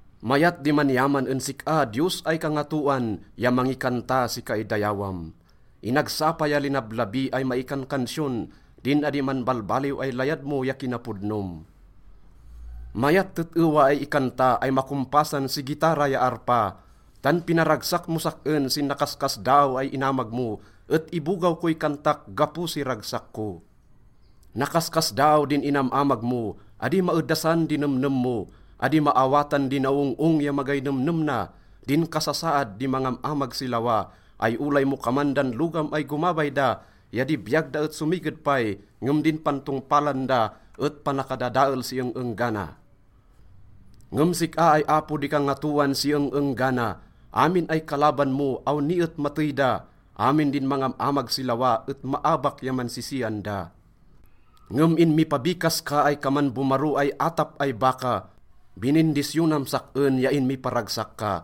Mayat di man-iyaman en sik-a, Diyos ay Kangatoan, ya mangikanta si kaidayawam. Inagsapa ya linablabi ay maikankansiyon din adi manbalbaliw ay layad mo ya kinapodnom. Mayat tet-ewa ay ikanta ay makompasan si gitara ya arpa. Tan pinaragsak mos sak-en sin nakaskasdaaw ay inamag mo et ibogaw koy kantak gapo si ragsak ko. Nakaskasdaaw din inam-amag mo, adi maedasan di nemnem mo. Adi maawatan di naong-ong ya magay nemnem na din kasasaad di mangam-amag si lawa ay olay mo kaman dan logam ay gomabay da ya di biyag da et somiged pay, ngem din pantongpalan da et panakadadael si eng-enggana. Ngem sik-a ay Apo di kangatoan si eng-enggana. Amin ay kalaban mo, awni et matey da, amin din mangam-amag si lawa et maabak ya mansisian da. Ngem inmipabikas ka ay kaman bomaro ay atap ay baka, binindisyonam sak-en ya inmiparagsak ka.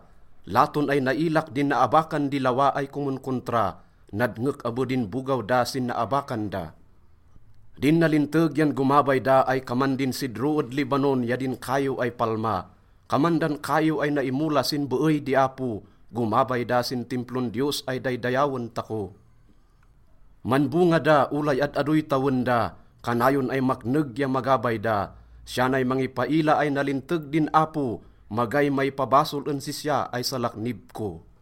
Laton ay nailak din naabakan di lawa ay komonkontra, nadngek abe din bogaw da sin naabakan da. Din nalinteg yan gomabay da ay kaman din sidro ed Lebanon ya din kaiw ay palma. Kaman dan kaiw ay naimola sin beey di Apo, gomabay da sin Timplon Diyos ay daydayawen tako. Manbonga da olay ad-adoy tawen da, kanayon ay makneg ya magabay da. Siya nay mangipaila ay nalinteg din Apo, magay maipabasol en sisya ay salaknib ko.